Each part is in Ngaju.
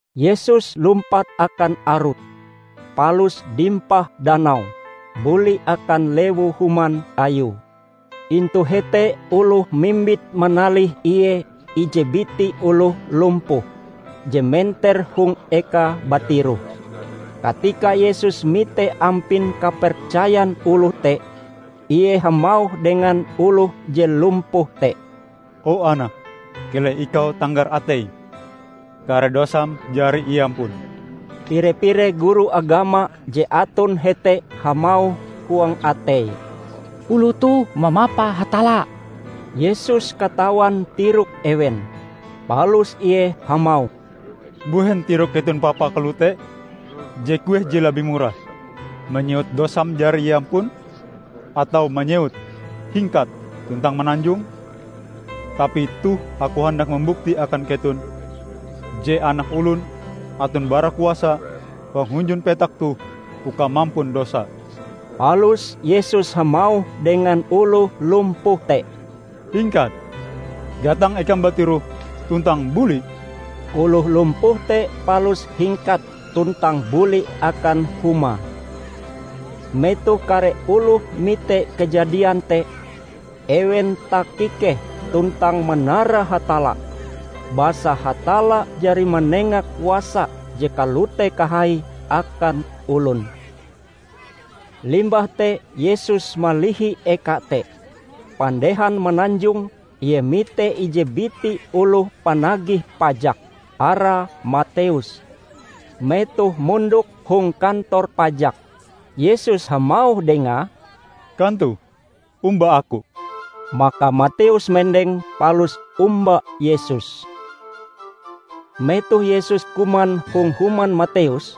Yesus lumpat akan arut, palus dimpah danau, buli akan lewu-human Ayue. Intu hete oloh mimbit manalih Ie ije biti oloh lumpuh, je menter hong ekae batiroh. Katika Yesus mite ampin kapercayan oloh te, Ie hamauh dengan oloh je lumpuh te, "O anak, keleh ikau tanggar ateim! Kare dosam jari iampun." Pire-pire guru agama je aton hete hamauh huang ateie, "Oloh toh mamapa Hatalla!" Yesus katawan tirok ewen, palus Ie hamauh, "Mbuhen tirok keton papa kalote? Je kueh je labih murah: manyewut 'Dosam jari iampun', atawa manyewut, 'Hingkat tuntang mananjong'? Tapi toh Aku handak mambukti akan keton je Anak Olon aton barakuasa hong hunjun petak toh uka mampun dosa." Palus Yesus hamauh dengan oloh lumpuh te, "Hingkat, gatang ekam batiroh, tuntang buli!" Oloh lumpuh te palus hingkat tuntang buli akan humae. Metoh kare oloh mite kajadian te, ewen takikeh tuntang manara Hatalla, basa Hatalla jari manenga kuasa je kalote kahai akan olon. Limbah te Yesus malihi eka te. Pandehan mananjong, Ie mite ije biti oloh panagih pajak, arae Mateus, metohe mondok hong kantor pajak. Yesus hamauh dengae, "Kantoh, omba Aku!" Maka Mateus mendeng palus omba Yesus. Metoh Yesus kuman hong human Mateus,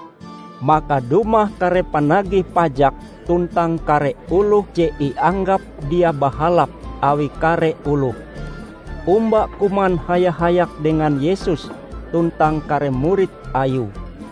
maka dumah kare panagih pajak tuntang kare oloh je ianggap dia bahalap awi kare oloh, omba kuman haya-hayak dengan Yesus tuntang kare murid Ayue.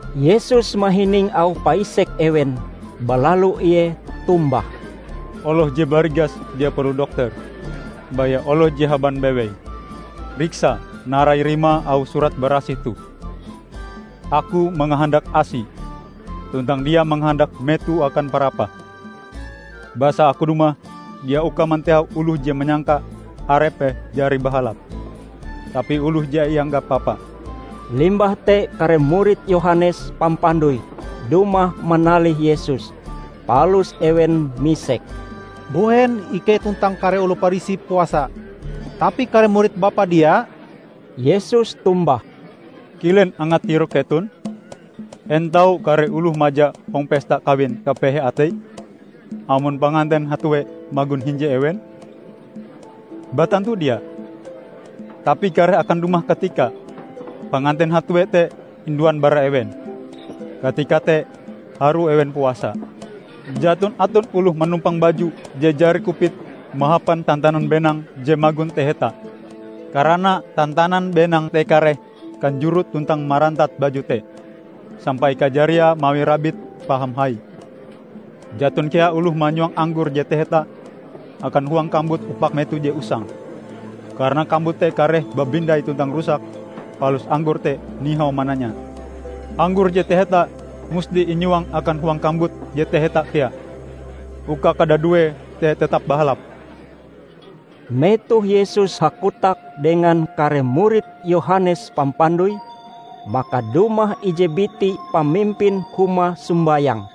Yesus mahining auh paisek ewen balalu Ie tombah, "Oloh je barigas dia perlu dokter, baya oloh je haban bewei. Riksa narai rimae auh Surat Barasih toh: 'Aku mangahandak asi, tuntang dia mangahandak meto akan parapah'. Basa Aku dumah dia uka mantehau oloh je manyangka arepe jari bahalap, tapi oloh je ianggap papa." Limbah te kare murid Yohanes Pampandoi dumah manalih Yesus. Palus ewen misek, "Mbuhen ikei tuntang kare oloh Parisi puasa tapi kare murid Bapa dia?" Yesus tombah, "Kilen angat tirok keton? En tau kare oloh maja hong pesta kawin kapehe ateie amon panganten hatue magon hinje ewen? Batantu dia! Tapi kareh akan dumah katikae panganten hatue te induan bara ewen. Katika te harue ewen puasa. Jaton aton oloh manumpang baju je jari kupit mahapan tantanan benang je magon taheta. Karana tantanan benang te kareh kanjorot tuntang marantat baju te, sampai kajariae mawi rabite paham hai. Jaton kea oloh manyuang anggor je taheta akan huang kambut upak meto je usang. Karana kambut te kareh babindai tuntang rusak, palus anggor te nihau mananya. Anggor je taheta musti inyuang akan huang kambut je taheta kea, uka kadaduee te tetep bahalap." Metoh Yesus hakotak dengan kare murid Yohanes Pampandoi, maka dumah ije biti pamimpin huma sombayang.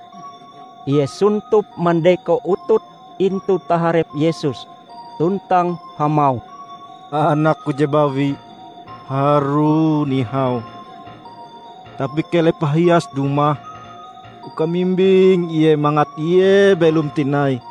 Ie sontop mandeko utute intu taharep Yesus tuntang hamauh, "Anakku je bawi harue nihau, tapi keleh pahias dumah uka mimbing ie mangat ie belom tinai."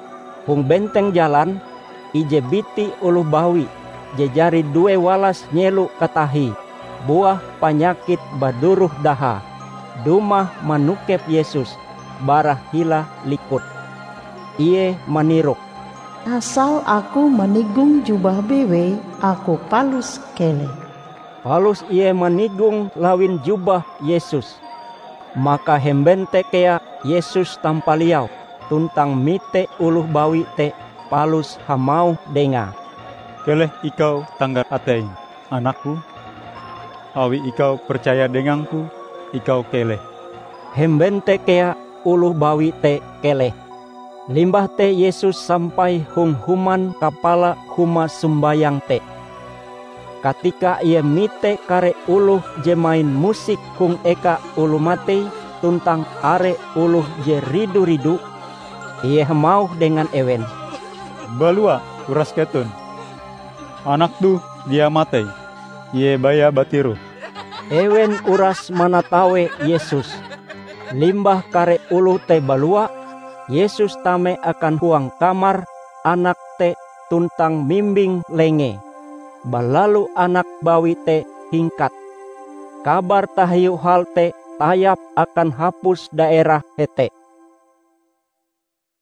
Hong benteng jalan, ije biti oloh bawi je jari due walas nyelo katahie buah panyakit baduroh dahae, dumah manokep Yesus bara hila likut. Ie manirok, "Asal aku manigong jubahe bewei, aku palus keleh." Palus ie manigong lawin jubah Yesus. Maka hemben te kea Yesus tampaliau tuntang mite oloh bawi te palus hamauh dengae, "Keleh ikau tanggar ateim, anak-Ku! Awi ikau percaya dengang-Ku, ikau keleh!" Hemben te kea oloh bawi te keleh. Limbah te Yesus sampai hong human kapala huma sombayang te. Katika Ie mite kare oloh je main musik hong eka oloh matei tuntang are oloh je ridu-ridu, Ie hamauh dengan ewen, "Balua urase keton! Anak toh dia matei; Ie baya batiroh." Ewen uras manatawe Yesus. Limbah kare oloh te balua, Yesus tame akan huang kamar anak te tuntang mimbing lengee. Balalu anak bawi te hingkat. Kabar tahiu hal te tayap akan hapus daerah hete.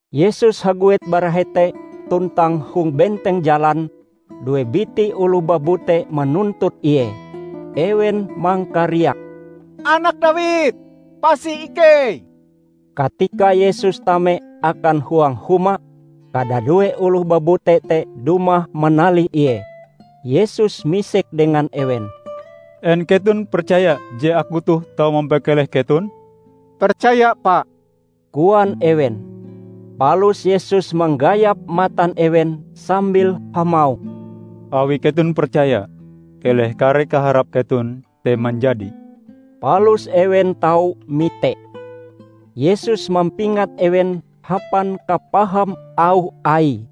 Yesus haguet bara hete tuntang hong benteng jalan due biti oloh babute manuntut Ie. Ewen mangkariak, "Anak Dawid, pasi ikei!" Katika Yesus tame akan huang huma, kadadue oloh babute te dumah manalih Ie. Yesus misek dengan ewen, "En keton percaya je Aku toh tau mampakeleh keton?" "Percaya Pa!" koan ewen. Palus Yesus manggayap matan ewen sambil hamauh, "Awi keton percaya, keleh kare kaharap keton te manjadi." Palus ewen tau mite. Yesus mampingat ewen hapan kapaham auh Aie,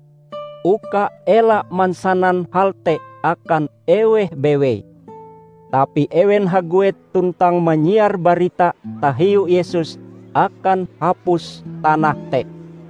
uka ela mansanan hal te akan eweh bewei. Tapi ewen haguet tuntang manyiar barita tahiu Yesus akan hapus tanah te.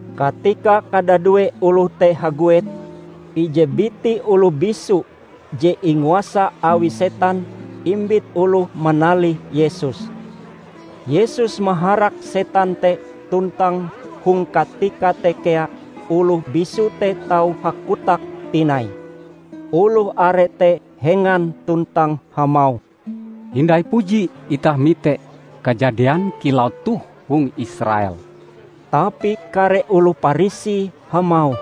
Katika kadadue oloh te haguet, ije biti oloh bisu je inguasa awi setan imbit oloh manalih Yesus. Yesus maharak setan te tuntang hong katika te kea oloh bisu te tau hakotak tinai. Oloh are te hengan tuntang hamauh, "Hindai puji itah mite kajadian kilau toh hong Israel!" Tapi kare oloh Parisi hamauh,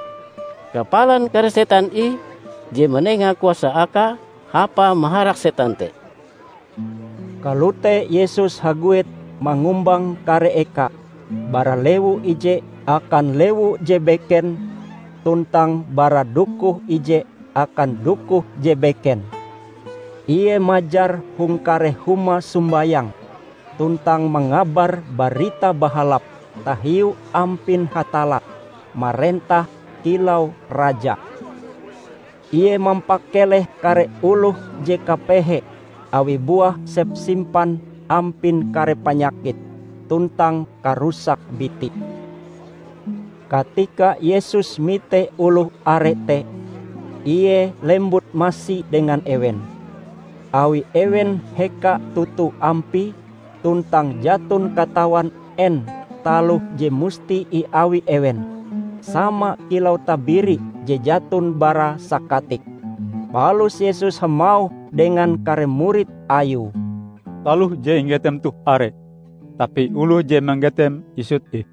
"Kapalan kare setan ih je manenga kuasa Akae hapa maharak setan te." Kalote Yesus haguet mangumbang kare eka bara lewu ije akan lewu je beken tuntang bara dokoh ije akan dokoh je beken. Ie majar hong kare huma sombayang tuntang mangabar Barita Bahalap tahiu ampin Hatalla marentah kilau Raja. Ie mampakeleh kare oloh je kapehe awi buah sepsimpan ampin kare panyakit tuntang karusak biti. Katika Yesus mite oloh are te, Ie lembut masi dengan ewen, awi ewen heka toto ampie tuntang jaton katawan en taloh je musti iawi ewen, sama kilau tabiri je jaton bara sakatik. Palus Yesus hamauh dengan kare murid Ayue, "Taloh je inggetem toh are, tapi oloh je manggeteme isut ih.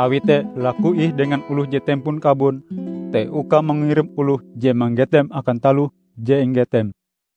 Awi te laku ih dengan oloh je tempon kabon te uka mangirim oloh je manggetem akan taloh je inggetem."